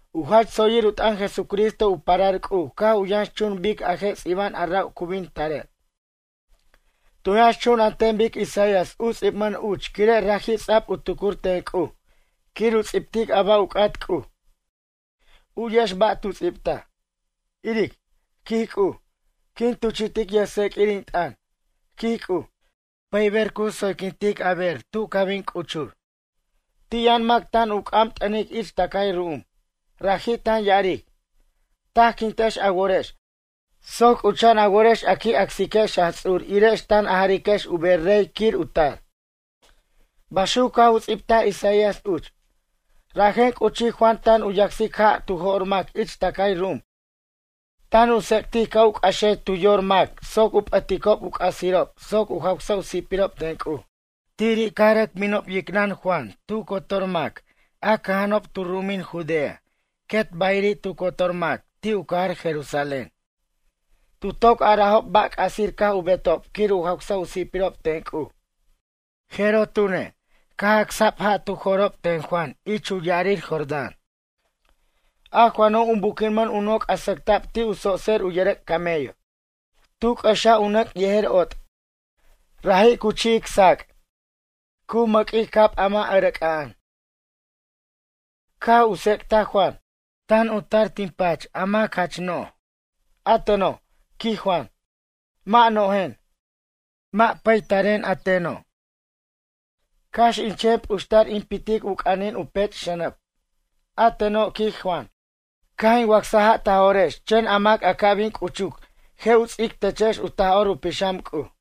U jach tsoyir u t'ʌn Jesucristo u parar C'uj caj u yʌnxchun bic a je' ts'iba'an a ra' cu bin tarej. Tu yʌnxchun an ten bic Isaías u ts'ibmʌn uch quire' raji' ts'a'b u tucur ten C'uj quir u ts'ibtic a ba' u c'at C'uj. U'yex ba' tu ts'ibtaj: Iric, quij C'uj, quin tuchi'tic yʌjtseq'uir in t'ʌn, quij C'uj, pʌyber cu tsoyquintic a ber tu ca bin c'uchur. Ti' yʌn mac tan u c'am t'ʌnic ich tʌcay ru'um. Raji' tan ya'aric: “Tajquintex a worex soc c'ucha'an a worex a qui' acsiquex Jaj Ts'ur irex tan a jariquex u ber rey quir u tar.” Baxuc caj u ts'ibtaj Isaías uch. Rajen c'uchij Juan tan u yacsic ja' tu jo'r mac ich tʌcay ru'um tan u tsec'tic ca' u c'axej tu yor mac soc u p'ʌticob u c'asirob soc u jawsa' u si'pirob ten C'uj. Tiri' caj rʌc binob yicnʌn Juan tu cotor mac a cʌja'anob tu ru'umin Judea quet bayiri' tu cotor mac ti' u cajar Jerusalén. Tu toc arajob ba' c'asir caj u betob quir u jawsa' u si'pirob ten C'uj. Jeroj tune', caj acsa'b ja' tu jo'rob ten Juan ich u ya'arir Jordán. A Juano' u buquinmʌn u noc' a sʌcta'b ti' u tsotser u yʌrʌc' camello. Tu c'ʌxaj u nʌc' yejer ot'. Raji' cu chi'ic sac'. Cu mʌquic cab a mʌ' ʌcrʌc'a'an. Caj u tsec'taj Juan: ―Tan u tar tin pach a mac jach no'j. A teno' ―quij Juan―, mʌ' no'jen. Mʌ' pataren, a teno', cax in chen p'uxtar in pitic u c'anin u pech' xʌnʌb. A teno' ―quij Juan―, caj in wacsaj ja' ta jo'rex chen a mac a ca' bin c'uchuc je' u ts'ic techex u Taj'or u Pixam C'uj.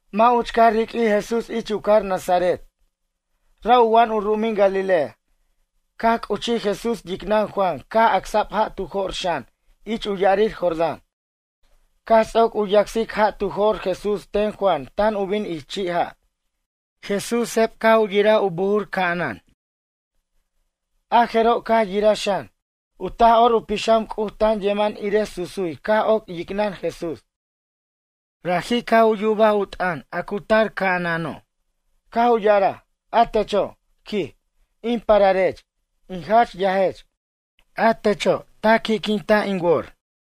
Mʌ' uch caj ruq'uij Jesús ich u cajar Nazaret, ra' u wa'an u ru'umin Galilea. Caj c'uchij Jesús yicnʌn Juan caj acsa'b ja' tu jo'r xan ich u ya'arir Jordán. Caj ts'oc u yacsic ja' tu jo'r Jesús ten Juan tan u bin ich chi' ja', Jesús seb caj u yiraj u buj ca'anan. A jeroj caj yiraj xan, u Taj'or u Pixam C'uj tan yeman irej susuy caj oc yicnʌn Jesús. Raji' caj u yubaj u t'ʌn a cu tar ca'anano', caj u ya'araj: ―A techo' ―quij―, in pararech, in jach yajech. A techo' ta qui'quin tin wore'.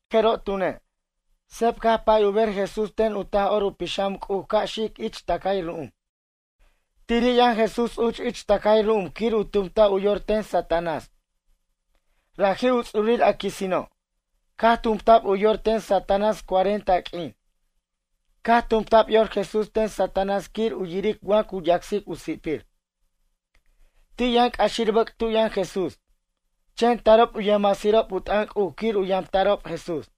A jeroj tune', seb caj pay u ber Jesús ten u Taj'or u Pixam C'uj ca' xic ich tʌcay ru'um. Tiri' yʌn Jesús uch ich tʌcay ru'um quir u tumta' u yor ten Satanás, raji' u ts'urir a quisino'. Caj tumta'b u yor ten Satanás cuarenta q'uin. Caj tumta'b yor Jesús ten Satanás quir u yiric wa cu yacsic u si'pir. Ti' yʌn c'axir bʌc' tu yʌn Jesús, chen tarob u yʌjmasirob u t'ʌn C'uj quir u yamta'rob Jesús.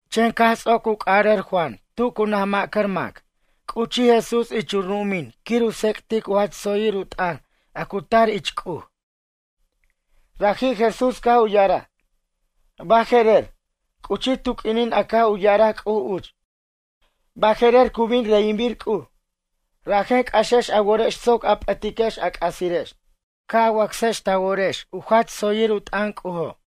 Chen caj ts'oc u c'ʌric Juan tu cu naj ma'cʌr mac, c'uchij Jesús ich u ru'umin quir u tsec'tic u jach tsoyir u t'ʌn a cu tar ich C'uj. Raji' Jesús caj u ya'araj: ―Baje'rer, c'uchij tu q'uinin a caj u ya'araj C'uj uch. Baje'rer cu bin reyinbir C'uj, rajen c'axex a worex soc a p'ʌtiquex a c'asirex, ca wacsiquex ta worex a jach tsoyir u t'ʌn C'ujo'.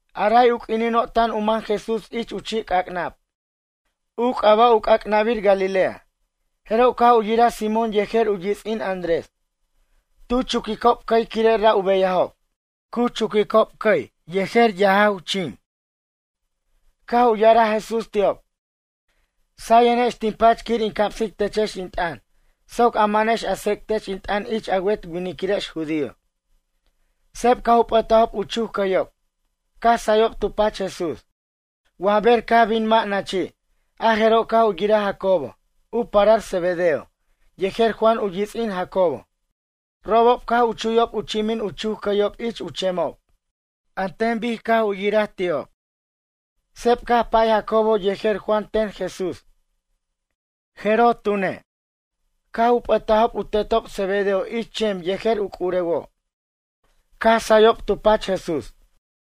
A ray u q'uinino' tan u man Jesús ich u chi' c'ac'nab, u c'aba' u c'ac'nabir Galilea, jeroj caj u yiraj Simón yejer u yits'in Andrés. Tu chuquicob cʌy quire' ra' u beyajob. Cu chuquicob cʌy yejer yajow chim. Caj u ya'araj Jesús ti'ob: ―Sayenex tin pach quir in camsic techex in t'ʌn soc a manex a tsec'tex in t'ʌn ich a wet winiquirex judío. Seb caj u p'ʌtajob u chuc cʌyob, caj sayob tu pach Jesús. Wa ber caj bin mʌ' nachi', a jeroj caj u yiraj Jacobo, u parar Zebedeo, yejer Juan u yits'in Jacobo. Robob caj u chuyob u chimin u chuc cʌyob ich u chemob. An ten bic caj u yiraj ti'ob, seb caj pay Jacobo yejer Juan ten Jesús. A jeroj tune', caj u p'ʌtajob u tetob Zebedeo ich chem yejer u c'urewo', caj sayob tu pach Jesús.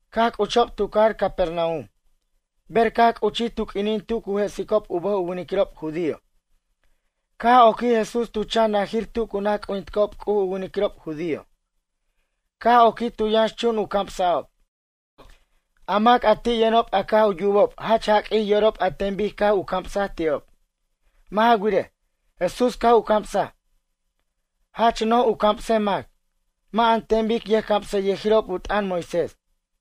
Caj c'uchob tu cajar Capernaum. Ber caj c'uchij tu q'uinin tu cu jesicob u bʌjob u winiquirob judío, caj oquij Jesús tu chan najir tu cu naj c'ujinticob C'uj u winiquirob judío. Caj oquij tu yʌnxchun u camsa'ob. A mac a ti' yʌnob a caj u yubob jach jaq'uij yorob an ten bic caj u camsaj ti'ob. Mʌ' ja wirej, Jesús caj u camsaj, jach noj u camsej mac. Mʌ' an ten bic yʌjcamsʌyʌjirob u t'ʌn Moisés.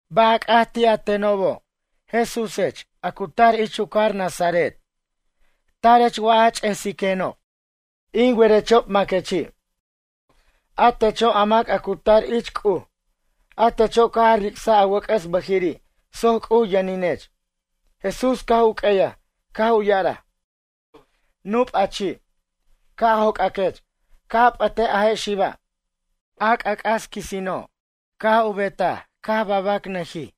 ―Ba' a c'at ti' a tenobo' Jesúsech a cu tar ich u cajar Nazaret? Tara'anech a ch'esiquenob, in werechob maquechi', a techo' a mac a cu tar ich C'uj, a techo' caj a ric'saj a wʌc'ʌs bʌjiri' soc C'uj yʌninech. Jesús caj u q'ueyaj, caj u ya'araj: ―Nup a chi', ca' joc'aquech, ca' a p'ʌtej a je' xiba'. A c'ac'as quisino', caj u betaj ca' babanʌqui',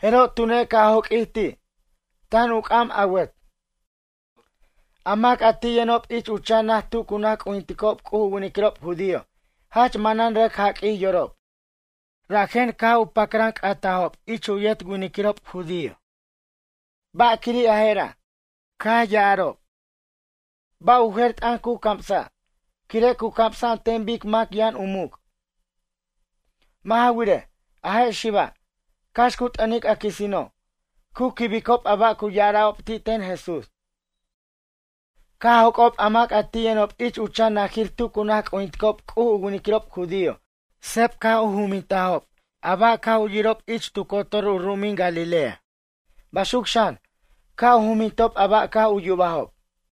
jeroj tune' caj joq'uij ti', tan u c'am awʌt. A mac a ti' yʌnob ich u chan naj tu cu naj c'ujinticob C'uj u winiquirob judío jach manan rʌc jaq'uij yorob, rajen caj u pacran c'aticob ich u yet winiquirob judío: ―Ba'quiri' a jera', quij ya'ara'ob? Ba' u jer t'ʌn cu camsa'? Quire' cu camsa' an ten bic mac yʌn u muc'. Mʌ' ja wirej, a je' xiba', cax cu t'ʌnic a quisino', cu quibicob a ba' cu ya'ara'ob ti' ten Jesús. Caj joc'ob a mac a ti' yʌnob ich u chan najir tu cu naj c'ujinticob c'uj u winiquirob judío seb caj u jumbintajob a ba' caj u yirob ich tu cotor u ru'umin Galilea, baxuc xan, caj u jumbintob a ba' caj u yubajob.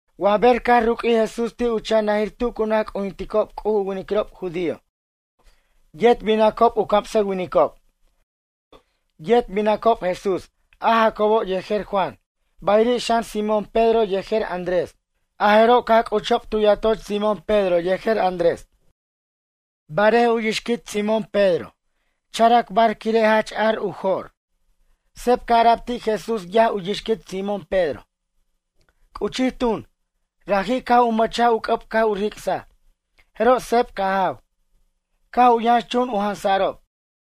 Wa ber caj ruq'uij Jesús ti' u chan najir tu cu naj c'ujintiob C'uj u winiquirob judío, yet binacob u camsʌwinicob. Yet binacob Jesús a Jacobo yejer Juan, bayiri' xan Simón Pedro yejer Andrés, a jeroj caj c'uchob tu yatoch Simón Pedro yejer Andrés. Barej u yixquit Simón Pedro characbar quire' jach ar u jo'r. Seb caj ara'b ti' Jesús yaj u yixquit Simón Pedro. C'uchij tun, raji', caj u mʌchaj u c'ʌb caj u ric'saj, jeroj seb caj jaw, caj u yʌnxchun u jansa'rob.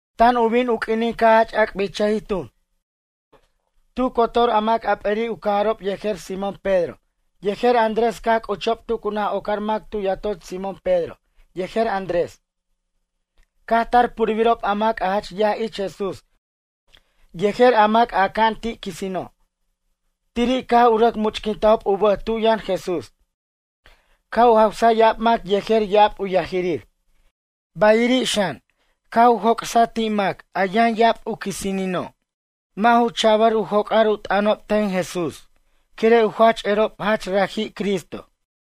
Tan u bin u q'uinin caj jach ac'bichʌjij tun. Tu cotor a mac a p'eri' u cajarob yejer Simón Pedro yejer Andrés caj c'uchob tu cu naj ocar mac tu yatoch Simón Pedro yejer Andrés. Caj tar purbirob a mac a jach yaj ich Jesús yejer a mac a aca'an ti' quisino'. Tiri' caj u rʌc much'quintajob u bʌj tu yʌn Jesús. Caj u jawsaj ya'ab mac yejer ya'ab u yajirir. Bayiri' xan, caj u joc'saj ti' mac a yʌn ya'ab u quisinino'. Mʌ' ju cha'bʌr u joc'ar u t'ʌnob ten Jesús quire' u jach erob jach raji' Cristo.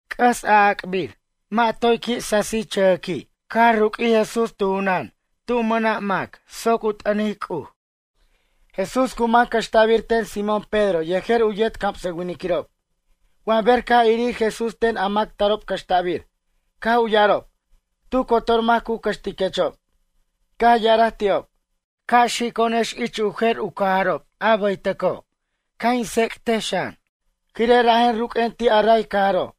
C'ʌs a'ac'bir mʌ' toy qui' sasichʌjʌqui' caj ruq'uij Jesús tu junan tu mʌna' mac soc u t'ʌnic C'uj. Jesús cu man cʌxta'bir ten Simón Pedro yejer u yet camsʌwiniquirob. Wa ber caj irir Jesús ten a mac tarob cʌxta'bir. Caj u ya'arob: ―Tu cotor mac cu cʌxtiquechob. Caj ya'araj ti'ob: ―Ca' xico'onex ich u jer cajarob a baytʌco' ca' in tsec'tej xan, quire' rajen ruq'uen ti' a ray cajaro'.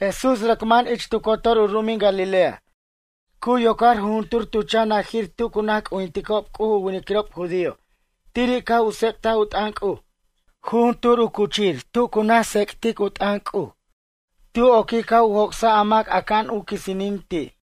Jesús rʌc man ich tu cotor u ru'umin Galilea cu yocar jujuntur tu chan najir tu cu naj c'ujinticob C'uj u winiquirob judío tiri' caj u tsec't u t'ʌn C'uj. Jujuntur u cuchir tu cu naj tsec'tic u t'ʌn C'uj tu oquij caj u joc'saj a mac aca'an u quisinin ti'.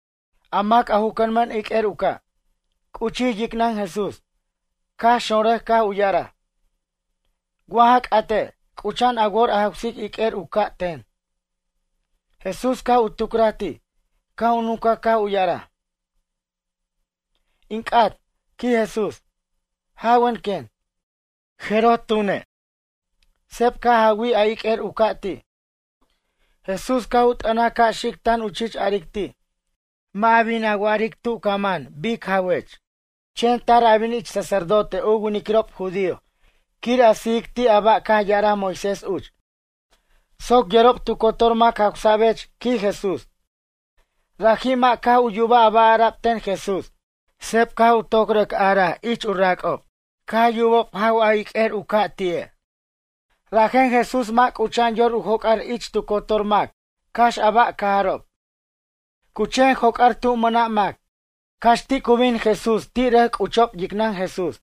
A mac a ju cʌnmʌn iq'uer u ca', c'uchij yicnʌn Jesús, caj xonrʌj caj u ya'araj: ―Wa ja c'ate', c'ucha'an a wor a jawsic iq'uer u ca' ten. Jesús caj u tucraj ti', caj u nuncaj caj u ya'araj: ―In c'at ―quij Jesús―, jawen quen. A jeroj tune', seb caj jawij a iq'uer u ca' ti'. Jesús caj u t'ʌnaj ca' xic tan u chich aric ti': ―Mʌ' a bin a wa'aric tu ca man bic jawech. Chen tar a bin ich sacerdote u winiquirob judío quir a sijic ti' a ba' caj ya'araj Moisés uch. Soc yerob tu cotor mac jawsa'bech ―quij Jesús. Raji' mʌ' caj u yubaj a ba' ara'b ten Jesús, seb caj u toc rʌc araj ich u rac'ob. Caj yubob jaw a iq'uer u ca' ti'e'. Rajen Jesús mʌ' c'ucha'an yor u joc'ar ich tu cotor mac cax a ba' cajarob. Cu chen joc'ar tu mʌna' mac, cax ti' cu bin Jesús ti' rʌc c'uchob yicnʌn Jesús.